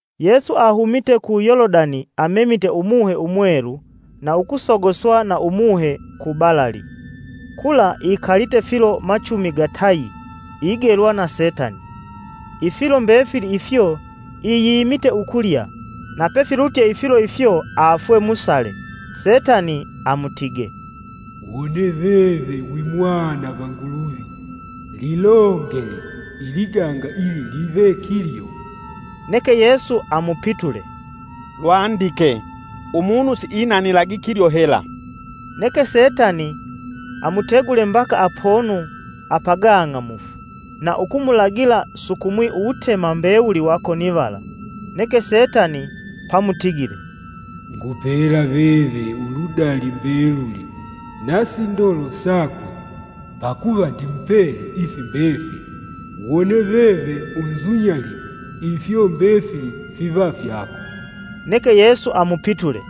Yesu ahumite ku Yolodani amemite Umuhe Umwelu na ukusogoswa na umuhe ku balali. Kula ikalite filo machumi gatayi igelwa na Setani. Ifilo mbefili ifyo iyimite ukulya. Napefilutye ifilo ifyo afwe musale. Setani amutige, “Wone veve wi mwana va Nguluvi lilongele iliganga ili live kilyo.” Neke Yesu amupitule, “Lwandike: ‘Umunu siinanilagi kilyo hela.’” Neke setani amutegule mbaka apono apagang'amufu, na ukumulagila sukumwi uwutema mbewuli wa konivala. Neke Setani pamutigile, “Ngupela veve uludali mbeluli, na sindolo sakwe; pakuva ndi mupele ifi mbefili. Wone veve unzunyalile, ifyo mbefili fiva fyako.” Neke Yesu amupitule,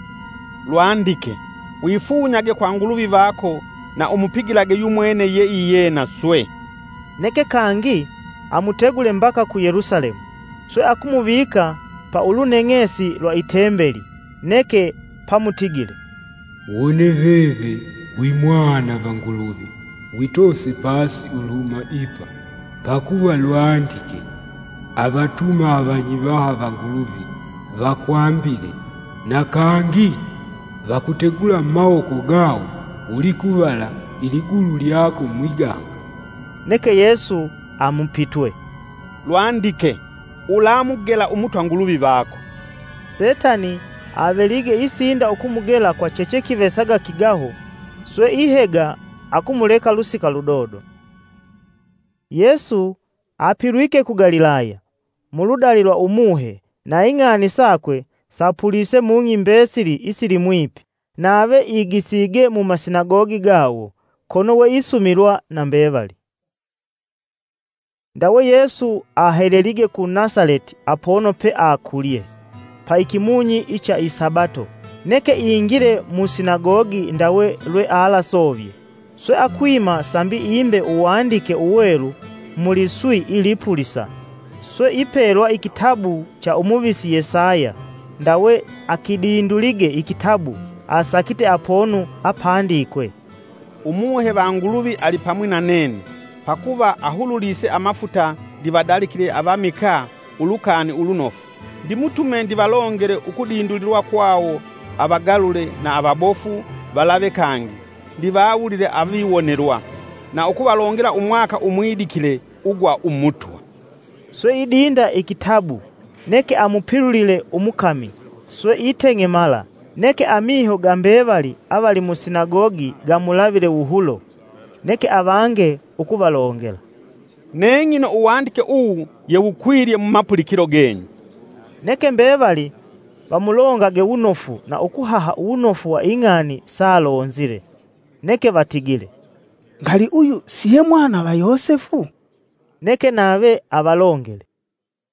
“Lwandike: ‘Wifunyage kwa Nguluvi vako na umupigilage yumwene ye iyena swe.’” Neke kangi amutegule mbaka ku Yelusalemu, swe akumuvika pa uluneng'esi lwa itembeli, neke pamutigile, “Wone veve wi Mwana va Nguluvi, witoose pasi uluhuma ipa, pakuva lwandike: ‘avatuma avanyivaha va Nguluvi vakwambile’, na kangi, ‘Vakutegula mumawoko gawo, ulikuvala iligulu lyako mwiganga.’” Neke Yesu amupitwe, “Lwandike: ‘Ulamugela umutwa Nguluvi vako.’” Setani avelige isinda ukumugela kwa chechekivesaga kigaho, swe ihega akumuleka lusika ludodo. Yesu apilwike ku Galilaya, muludali lwa Umuhe. Na ing'ani sakwe sapulise mung'i mbesili isilimwipi. Nave igisige mumasinagogi gawo, kono we isumilwa na mbevali. Ndawe Yesu ahelelige ku Nasaleti apono pe akulye, pa ikimunyi icha isabato neke ingile musinagogi ndawe lwealasovye. Swe akwima sambi imbe Uwandike Uwelu mu liswi ilipulisa. Swe ipelwa ikitabu cha umuvisi Yesaya ndawe akidindulige ikitabu asakite apono apandikwe: “Umuhe va Nguluvi alipamwi na nene, pakuva ahululise amafuta ndivadalikile avamikaa Ulukani Ulunofu. Ndimutume ndivalongele ukudindulilwa kwawo avagalule na avabofu valave kangi ndivawulile aviwonelwa. Na ukuvalongela umwaka umwidikile ugwa Umutwa.” Swe idinda ikitabu neke amupilulile umukami swe iteng'emala neke amiho ga mbevali avali musinagogi gamulavile wuhulo. Neke avange ukuvalongela, “Neng'ino uwandike uwu yewukwilye mumapulikilo genyu.” Neke mbevali vamulongage wunofu na ukuhaha uwunofu wa ing'ani saalonzile. Neke vatigile, “Ngali uyu siye mwana va Yosefu?” Neke nave avalongele,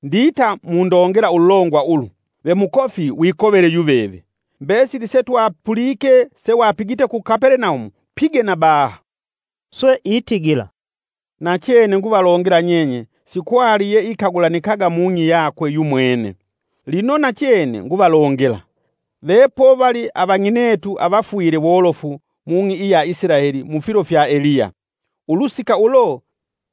“Ndita mundongela ululongwa ulu, ‘Ve mukofi wikovele yuveve’, ‘Mbesili setwapulike sewapigite ku Kapelenaumu, pige na baha.’” Swe itigila, “Nachene nguvalongela nyenye sikwali yeikagulanikaga mung'i yakwe yumwene. Lino nachene nguvalongela! Vepovali avang'inetu avafwile wolofu mung'i iya Isilaeli mufilo fya Eliya, ulusika ulo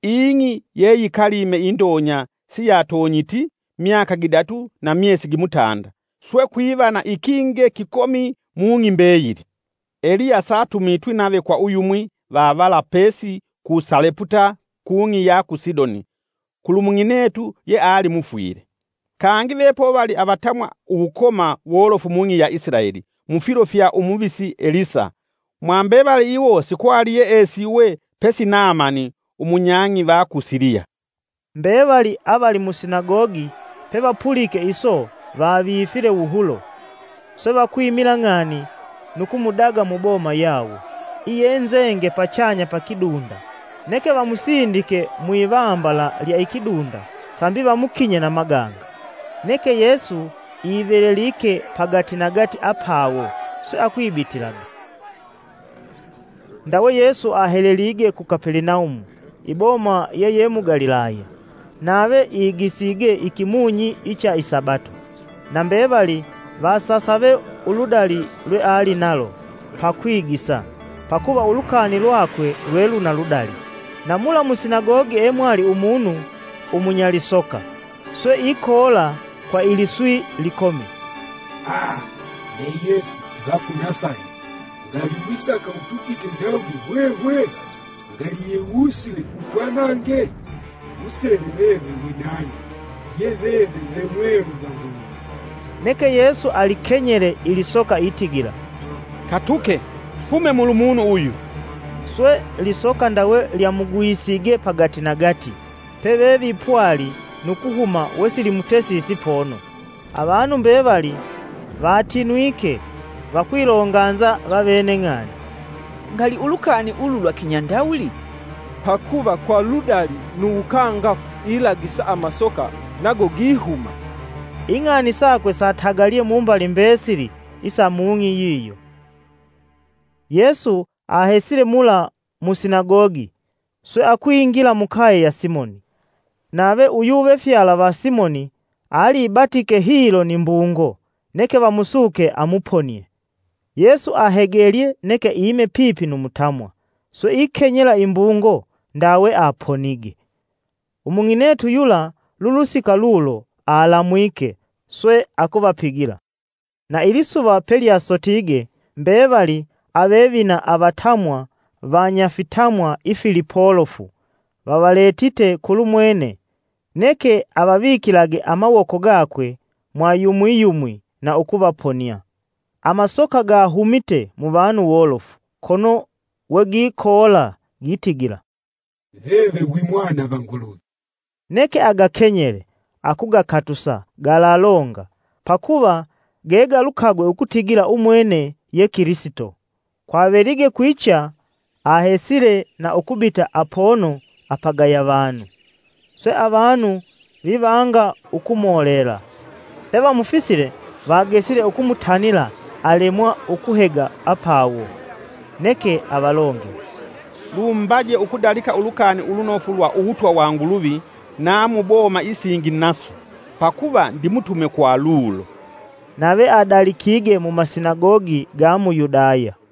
ing'i ye yikalime indonya siyatonyiti myaka gidatu na myesi gimutanda, swe kwiva na ikinge kikomi mung'i mbeyili. Eliya satumitwi nave kwa uyumwi va vala pesi ku Saleputa kung'i iya ku Sidoni kulumung'inetu yeali mufwile. Kangi vepovali avatamwa uwukoma wolofu mung'i ya Isilaeli mufilo fya umuvisi Elisa, mwambevali iwo sikwali yeesiwe pesi Naamani, umunyang'i va ku Siliya” Mbevali avali musinagogi pevapulike iso, vavifile wuhulo. Swe vakwimila ng'ani nu kumudaga mu boma yawo, iyenzenge pachanya pa kidunda neke vamusindike mwivambala lya ikidunda sambi vamukinye na maganga. Neke Yesu ivelelike pagatinagati apawo, swe akwibitilaga. Ndawe Yesu ahelelige ku Kapelenaumu, iboma yeye mu Galilaya. Nave igisige ikimunyi icha i Sabato. Na mbevali vasasave uludali lwealinalo pakwigisa. pakuva ulukani lwakwe lwe luna ludali. Na mula musinagogi emwali umunu umunyalisoka; swe ikoola kwa iliswi likomi, “Aa! Be Yesu va ku Nasaleti ngali wisaka utugite ndawuli hwehwe? Ngali yewusile utwanange? Ngusele veve wi nani; ye veve ve Mwelu va Nguluvi!” Neke Yesu alikenyele, ilisoka itigila, “Katuke! Hume mulumunu uyu!” Swe lisoka ndawe lyamugwisige pagatinagati pevevipwali nu kuhuma wesilitesisi pono. Avanu mbevali vatinwike vakwilonganza vavene ng'ani, “Ngali ulukani ulu lwa kinyandawuli? Pakuva kwa ludali nu uwukangafu ilagisa amasoka nago gihuma!” Ing'ani sakwe satagalye mumbali mbesili isa mung'i yiyo. Yesu ahesile mula musinagogi swe akwingila mukaye ya Simoni. Nave uyuvefyala va Simoni, alibatike hilo ni mbungo, neke vamusuke amuponie. Yesu ahegelye neke ime pipi nu mutamwa swe ikenyela imbungo ndawe aponige. Umung'inetu yula lulusika lulo alamwike swe akuvapigila. Na ilisuva pelyasotige mbevali avevina avatamwa vanyafitamwa ifilipolofu vavaletite kulumwene, neke avavikilage amawoko gakwe mwa yumwiyumwi na ukuvaponia. Amasoka gahumite muvanu wolofu, kono wegikoola gitigila, “Veve wi mwana va Nguluvi.” Neke agakenyele akugakatusa, galalonga pakuva gegalukagwe ukutigila umwene ye Kilisito. Kwavelige kwicha ahesile na ukubita apono apagaya vanu. Swe avanu vivanga ukumolela, pevamufisile vagesile ukumutanila alemwa ukuhega apawo. Neke avalongele, “Lumbaje ukudalika Ulukani Ulunofu lwa uwutwa wa Nguluvi na mu boma isingi naso, pakuva ndimutume kwa lulo.” Nave adalikige mumasinagogi ga mu Yudaya.